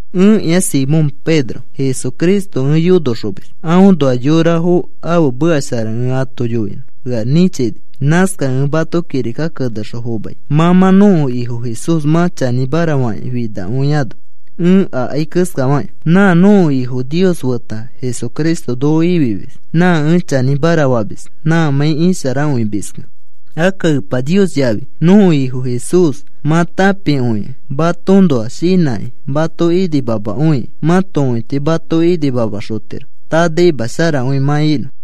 Ẽkĩa Simón Pedro, Jesucristo ẽ yonoxomis. Aõnoa yorafo ãfe meka shara ẽ ato yoinõ ea nĩchini. Nãskakẽ ẽ mato kirika kenexõ fomai, mã mã nõko Ifo Jesús mã chanĩmara fakĩ finakõiano ẽ akai keskafakĩ. Nã nõko Ifo Nios feta Jesucristo noko ifimis nã ẽ chanĩmara famis nãmãi isharakõimiskẽ. Akka Epa Nios yafi nõko Ifo Jesús mã tãpikõikẽ matoõnoa shinãkĩ mato inimamakõikĩ mãto õiti mato inimamaxotiro tanaima sharakõi mã inõ.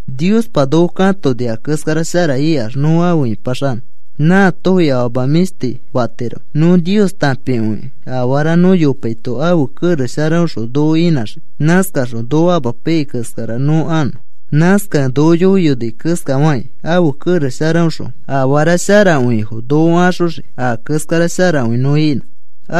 Niospa noko katoni a keskara shara ikax nõ afe ĩpaxanõ. Nãatofi afama mĩshti fatiroki. Nõ Nios tãpikõikẽ afara nõ yopaito ãfe kerex sharaõxõ noko inãxii. Nãskaxõ noko amapaiyai keskara nõ anõ. Nãskakẽ noko yoiyoni keskafakĩ ãfe kerex sharaõxõ afara sharakõifo noko axoxii a keskara sharakõi nõ inõ.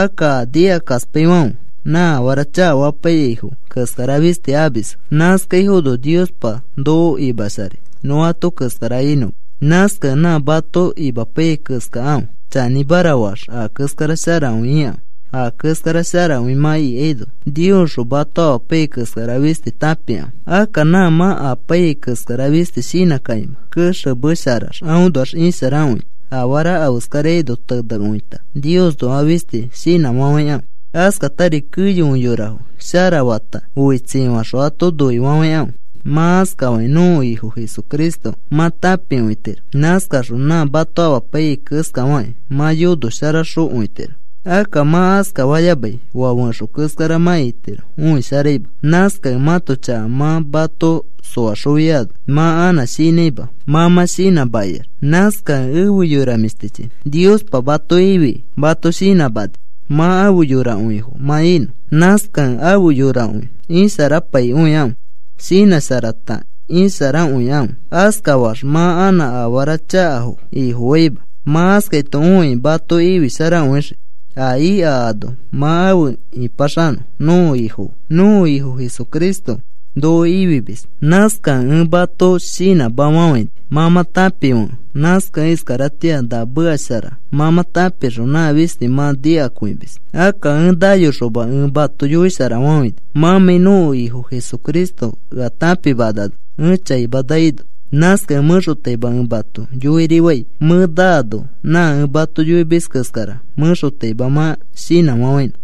Akka a nikakaspaifãfe nã afara chakafapaiyaifo keskara fisti amisfo. Nãskaifono Niospa noko imasharai nõ ato keskara inõma. Nãskakẽ nã mato imapaiyai keskakãfe, chanĩmara faax a keskara sharakõi ikãfe. A keskara sharakõi mã ikaino, Niosxõ mato amapaiyai keskara fisti tãpikãfe. Akka nã mã apaiyai keskara fisti shinãkakĩma, kexemesharax aõnoax isharakõita afara afeskaraino tenekõita Niosnoa fisti shinãfafãikãfe. Askatari keyokõi yorafo sharafata oitsifaxõ ato noifafãikãfe. Mã askafakĩ nõko Ifo Jesucristo mã tãpikõitiro. Nãskaxõ nã mato amapaiyai keskafakĩ mã yonoxosharakõitiro. Akka mã askafayamai oa fẽxo keskara mã itiro, õisharaima. Nãskakẽ mãto chaka mã mato soaxofiano mã anã shinãima, mã mã shinãmakiax. Nãskakẽ efe yora mĩshtichi, Niospa mato ifikĩ mato shinãmani mã afe yorakõifo mã inõ. Nãskakẽ afe yorakõi isharapaikõikãfe. Shinãsharata isharakõikãfe. Askafaax mã anã afara chakafo ifofaima. Mã askaito õikĩ mato ifisharakõixii a ika ano mã afe ĩpaxanõ nõko Ifo fe. Nõko Ifo Jesucristo noko ifimis. Nãskakẽ ẽ mato shinãmafafãini, mã mã tãpifekẽ, nãskakẽ iskaratĩa na meka shara mã mã tãpixõ nã fisti mã shinãkõimis. Akka ẽ nayoxoma ẽ mato yoisharafafãini, mãmãi nõko Ifo Jesucristo ea tãpimanano ẽ chaima naino. Nãskakẽ mẽxotaima ẽ mato yoirifai mẽ naano nã ẽ mato yoimis keskara mẽxotaima mã shinãfafãinõ.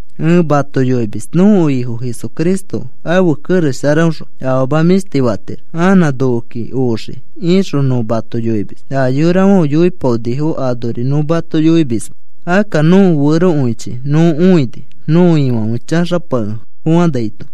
Nõ mato yoimis nõko Ifo Jesucristo ãfe kerex sharaõxõ afama mĩshti fatiro. “Anã nokoki oxii,” ixõ nõ mato yoimis. A yorafãfe yoipaonifo anori nõ mato yoimisma. Akka nõko ferokõichi nõ õini, nõko Ifãfe chaxapakefofãnaito.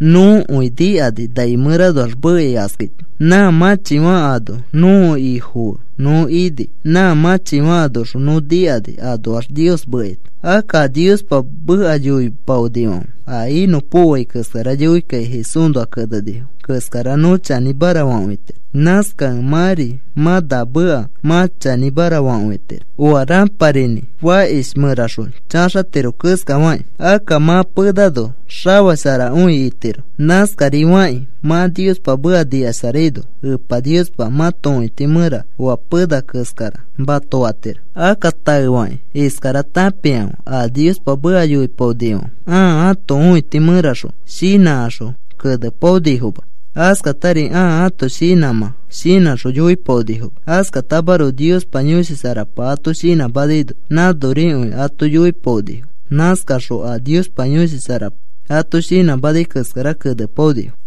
Nõkõi nikani nai mẽranoax mekai askaito. Nã mãchifã ano nõko Ifo fe nõ ini, nã mãchifã anoxõ nõ nikani anoax Nios mekaito. Akka a Niospa meka yoipaonifãfe a inõpokoai keskara yoikakĩ Jesúsnoa kenenifo keskara nõ chanĩmara fakõitiro. Nãskakẽ mãri mã na meka mã chanĩmara fakõitiro. Oa rãparinĩ fakish mẽraxõ chaxatiro keskafakĩ, akka mã penano xafasharakõitiro. Nãskarifakĩ mã Niospa meka nikasharaino Epa Niospa mãto õiti mẽra oa pena keskara mato fatiro. Akka taefakĩ iskara tãpikãfe. A Niospa meka yoipaonifãfe ãa ãto õiti mẽraxõ shinãkaxõ kenepaonifoma. Askatari ãa ãto shinãmã shinãxõ yoipaonifoma. Askatamaroko Niospa Yõshi Sharapa ato shinãmanaino nãnorikõi ato yoipaonifo. Nãskakaxõ a Niospa Yõshi Sharapa ato shinãmanai keskara kenepaonifo.